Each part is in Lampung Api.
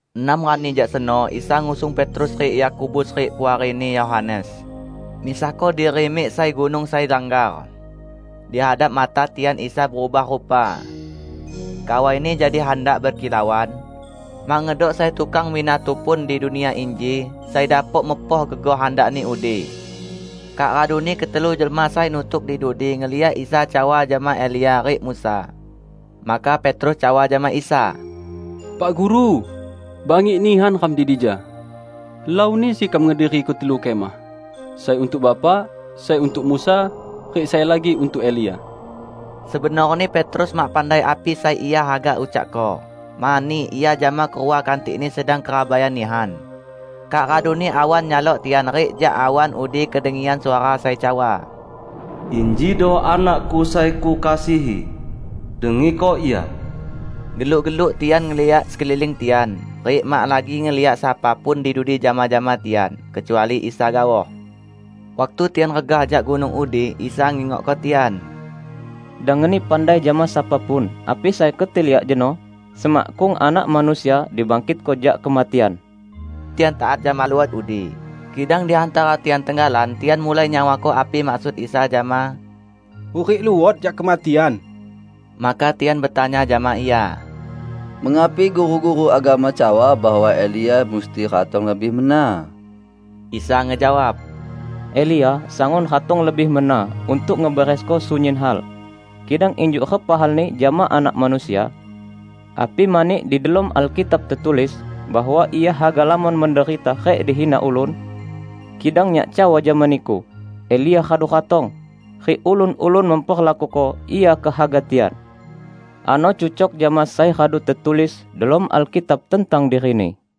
Enam rani jak seno Isa ngusung Petrus rik Yakobus rik puarini Yohanes, misahko diri mik sai gunung sai langgar. Di hadap mata tian Isa berubah rupa. Kawai-Ni jadi handak bekilauan. Mak ngedok sai tukang binatu pun di dunia inji sai dapok mepoh gegoh handakni udi. Kak raduni ketelu jelma sai nutuk di dudi ngeliak Isa cawa jama Elia rik Musa. Maka Petrus cawa jama Isa, "Pak Guru, bangik nihan ram di dija. Helauni sekam ngediriko telu kemah: sai untuk Bapak, sai untuk Musa, rik sai lagi untuk Elia." Sebenorni Petrus mak pandai api sai ia haga ucakko, mani ia jama kerua kantikni sedang kerabaian nihan. Kak raduni awan nyalok tian rik jak awan udi kedengian suara sai cawa, "Injido Anak-Ku sai Kukasihi. Dengiko Ia!" Geluk-geluk tian ngeliak sekeliling tian, rik mak lagi ngeliak sapa pun di dudi jama-jama tian, kecuali Isa gaoh. Waktu tian regah jak gunung udi, Isa ngingokko tian, "Dang ngeni pandai jama sapa pun api sai keti liak jeno semakkung Anak Manusia dibangkitko jak kematian." Tian taat jama luhot udi, kidang di hantara tian tenggalan tian mulai nyawako api maksud Isa jama "hurik luot jak kematian". Maka tian betanya jama Ia, "Mengapi guru-guru agama cawa bahwa Elia musti ratong lebih mena?" Isa ngejawab, "Elia sangun ratong lebih mena untuk ngeberesko sunyin hal. Kidang injuk repa halni jama Anak Manusia? Api mani di delom Alkitab tetulis bahwa Ia haga lamon menderita rik dihina ulun? Kidang Nyak cawa jama niku: Elia radu ratong, rik ulun-ulun memperlakuko ia kehaga tian. Ano cucok jama sai radu tetulis delom Alkitab tentang dirini."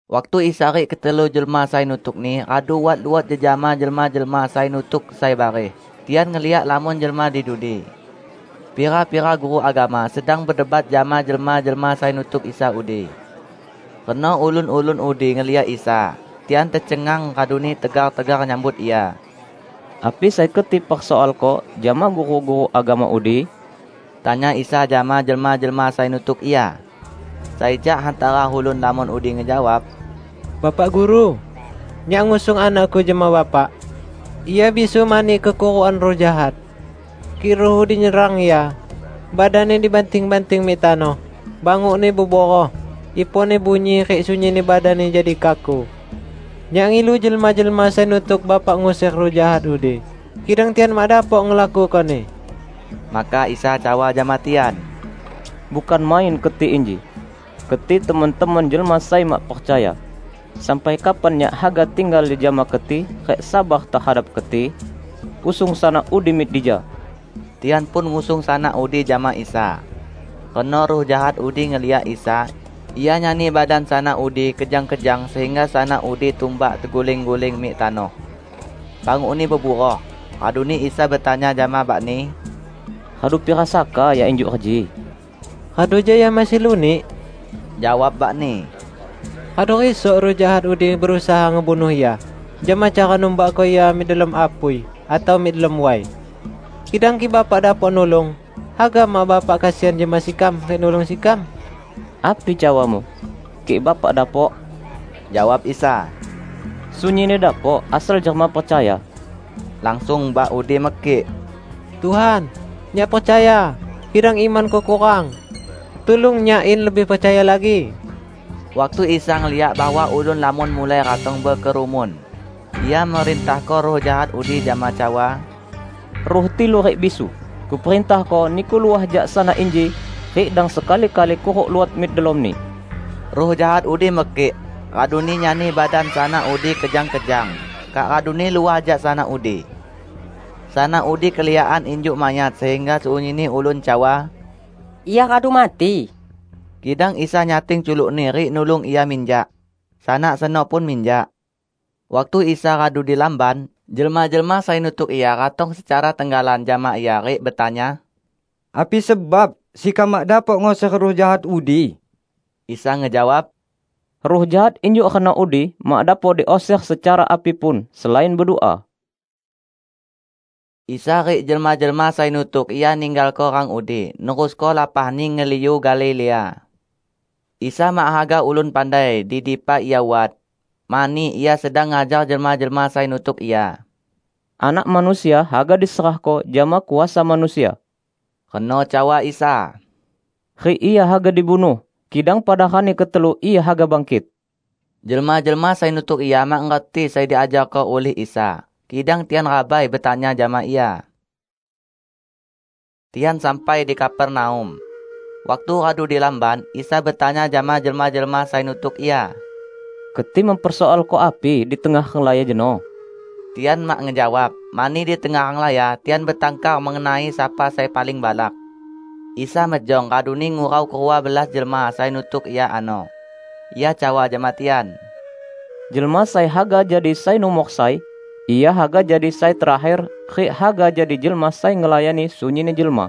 Waktu Isa rik ketelu jelma sai nutuk-Ni radu wat luot jejama jelma-jelma sai nutuk sai bareh, tian ngeliak lamon jelma di dudi. Pira-pira guru agama sedang bedebat jama jelma-jelma sai nutuk Isa udi. Reno ulun-ulun udi ngeliak Isa, tian tecengang, raduni tegar-tegar nyambut Ia. "Api sai keti persoalko jama guru-guru agama udi?" tanya Isa jama jelma-jelma sai nutuk Ia. Sai jak hantara ulun lamon udi ngejawab, "Bapak Guru, nyak ngusung anakku jama Bapak. Ia bisu mani kekurukan ruh jahat. Kik ruh udi nyerang ia, badanni dibanting-banting mik tanoh, bangukni beburoh, iponni bunyi rik sunyinni badanni jadi kaku. Nyak ngilu jelma-jelma sai nutuk Bapak nguser ruh jahat udi, kidang tian mak dapok ngelakukoni." Maka Isa cawa jama tian, "Bukan main keti inji! Keti temon-temon jelma sai mak percaya. Sampai kapan Nyak haga tinggal jejama keti rik sabar tehadap keti? Usung sanak udi mik dija!" Tian pun ngusung sanak udi jama Isa. Reno ruh jahat udi ngeliak Isa, ia nyani badan sanak udi kejang-kejang sehingga sanak udi tumbak teguling-guling mik tanoh. Bangukni beburoh. Raduni Isa betanya jama bakni, "Radu pira saka ia injuk reji?" "Radu jak ia masih lunik!" jawab bakni. "Radu risok ruh jahat udi berusaha ngebunuh ia jama cara numbakko ia mik delom apui atau mik delom way. Kidang kik Bapak dapok nulung, haga mak Bapak kesian jama sekam rik nulung sekam!" "Api cawamu? Kik Bapak dapok?" jawab Isa. "Sunyinni dapok, asal jelma percaya!" Langsung bak udi mekik, "Tuhan, nyak percaya, kidang imanku kurang. Tulung nyak in lebih percaya lagi!" Waktu Isa ngeliak bahwa ulun lamon mulai ratong bekerumun, Ia merintahko ruh jahat udi jama cawa, "Ruh tilu rik bisu, Kuperintahko niku luah jak sanak inji rik dang sekali-kali kuruk luot mik delomni!" Ruh jahat udi mekik, raduni nyani badan sanak udi kejang-kejang, kak raduni luah jak sanak udi. Sanak udi keliakan injuk mayat sehingga sunyinni ulun cawa, "Ia radu mati!" Kidang Isa nyating culukni rik nulung ia minjak. Sanak seno pun minjak. Waktu Isa radu di lamban, jelma-jelma sai nutuk Ia ratong secara tenggalan jama Ia rik betanya, "Api sebab sekam mak dapok nguser ruh jahat udi?" Isa ngejawab, "Ruh jahat injuk reno udi mak dapok diuser secara api pun, selain bedua." Isa rik jelma-jelma sai nutuk Ia ninggalko rang udi nerusko lapahni ngeliu Galilea. Isa mak haga ulun pandai di dipa Ia wat, mani Ia sedang ngajar jelma-jelma sai nutuk Ia. "Anak Manusia haga diserahko jama kuasa manusia," reno cawa Isa, "rik Ia haga dibunuh, kidang pada rani ketelu Ia haga bangkit!" Jelma-jelma sai nutuk Ia mak ngerti sai diajarko ulih Isa, kidang tian rabai betanya jama Ia. Tian sampai di Kapernaum. Waktu radu di lamban, Isa betanya jama jelma-jelma sai nutuk Ia, "Keti mempersoalko api di tengah renglaya jeno?" Tian mak ngejawab, mani di tengah renglaya tian betangkar mengenai sapa sai paling balak. Isa mejong, raduni ngurau kerua belas jelma sai nutuk Ia ano. Ia cawa jama tian, "Jelma sai haga jadi sai numor sai, ia haga jadi sai terakher rik haga jadi jelma sai ngelayani sunyinni jelma."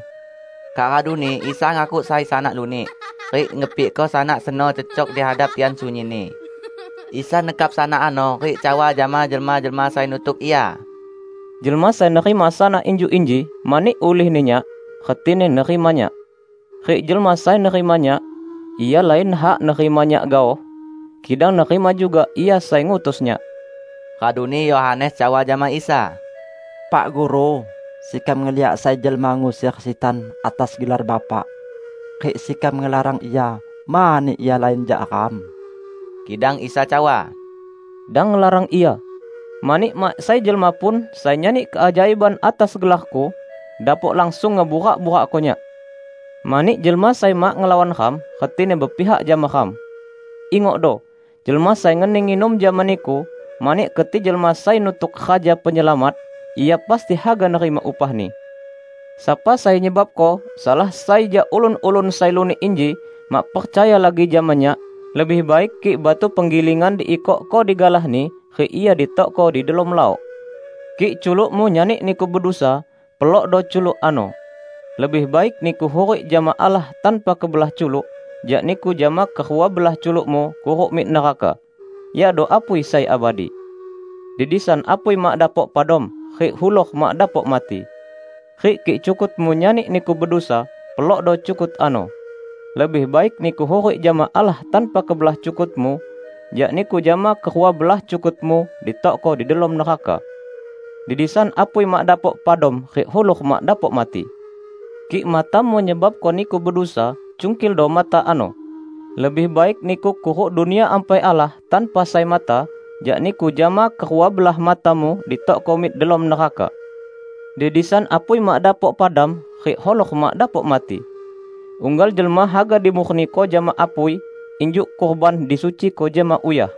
Kak raduni Isa ngakuk sai sanak lunik, rik ngepikko sanak seno cecok di hadap tian sunyinni. Isa nekap sanak ano rik cawa jama jelma-jelma sai nutuk Ia, "Jelma sai nerima sanak injuk inji mani ulihni Nyak, retini nerima Nyak. Rik jelma sai nerima Nyak, ia lain hak nerima Nyak gaoh, kidang nerima juga Ia sai ngutus Nyak." Raduni Yohanes cawa jama Isa, "Pak Guru, sekam ngeliak sai jelma nguser sitan atas gelar Bapak. Rik sekam ngelarang ia mani ia lain jak ram." Kidang Isa cawa, "Dang ngelarang ia, mani mak sai jelma pun sai nyani keajaiban atas gelar-Ku, dapok langsung ngeburak-burakko Nyak. Mani jelma sai mak ngelawan ram, retini bepihak jama ram. Ingokdo! Jelma sai ngeni nginum jama niku mani keti jelma sai nutuk Raja Penyelamat, ia pasti haga nerima upahni." "Sapa sai nyebabko salah sai jak ulun-ulun sai lunik inji mak percaya lagi jama Nyak, lebih baik kik batu penggilingan diikokko digalahni, rik ia ditokko di delom lawok. Kik culukmu nyani niku bedusa, pelokdo culuk ano! Lebih baik niku hurik jama Allah tanpa kebelah culuk jak niku jama kerua belah culukmu kuruk mik neraka, yakdo apui sai abadi. [ Di disan apui mak dapok padam, rik hulor mak dapok mati.] Rik kik cukutmu nyani niku bedusa, pelokdo cukut ano. Lebih baik niku hurik jama Allah tanpa kebelah cukutmu, jak niku jama kerua belah cukutmu ditokko di delom neraka. [ Di disan apui mak dapok padam rik hulor mak dapok mati.] Kik matamu nyebabko niku bedusa, cungkildo mata ano! Lebih baik niku kuruk Dunia Ampai Allah tanpa sai mata, jak niku jama kerua belah matamu ditokko mik delom neraka. Di disan apui mak dapok padam rik hulor mak dapok mati. Unggal jelma haga dimurniko jama apui, injuk kurban disuciko jama uyah.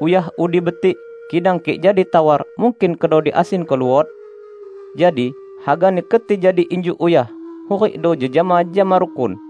Uyah udi betik, kidang kik jadi tawar, mungkin kedo diasinko luot? Jadi, hagani keti jadi injuk uyah -- hurikdo jejama jama rukun."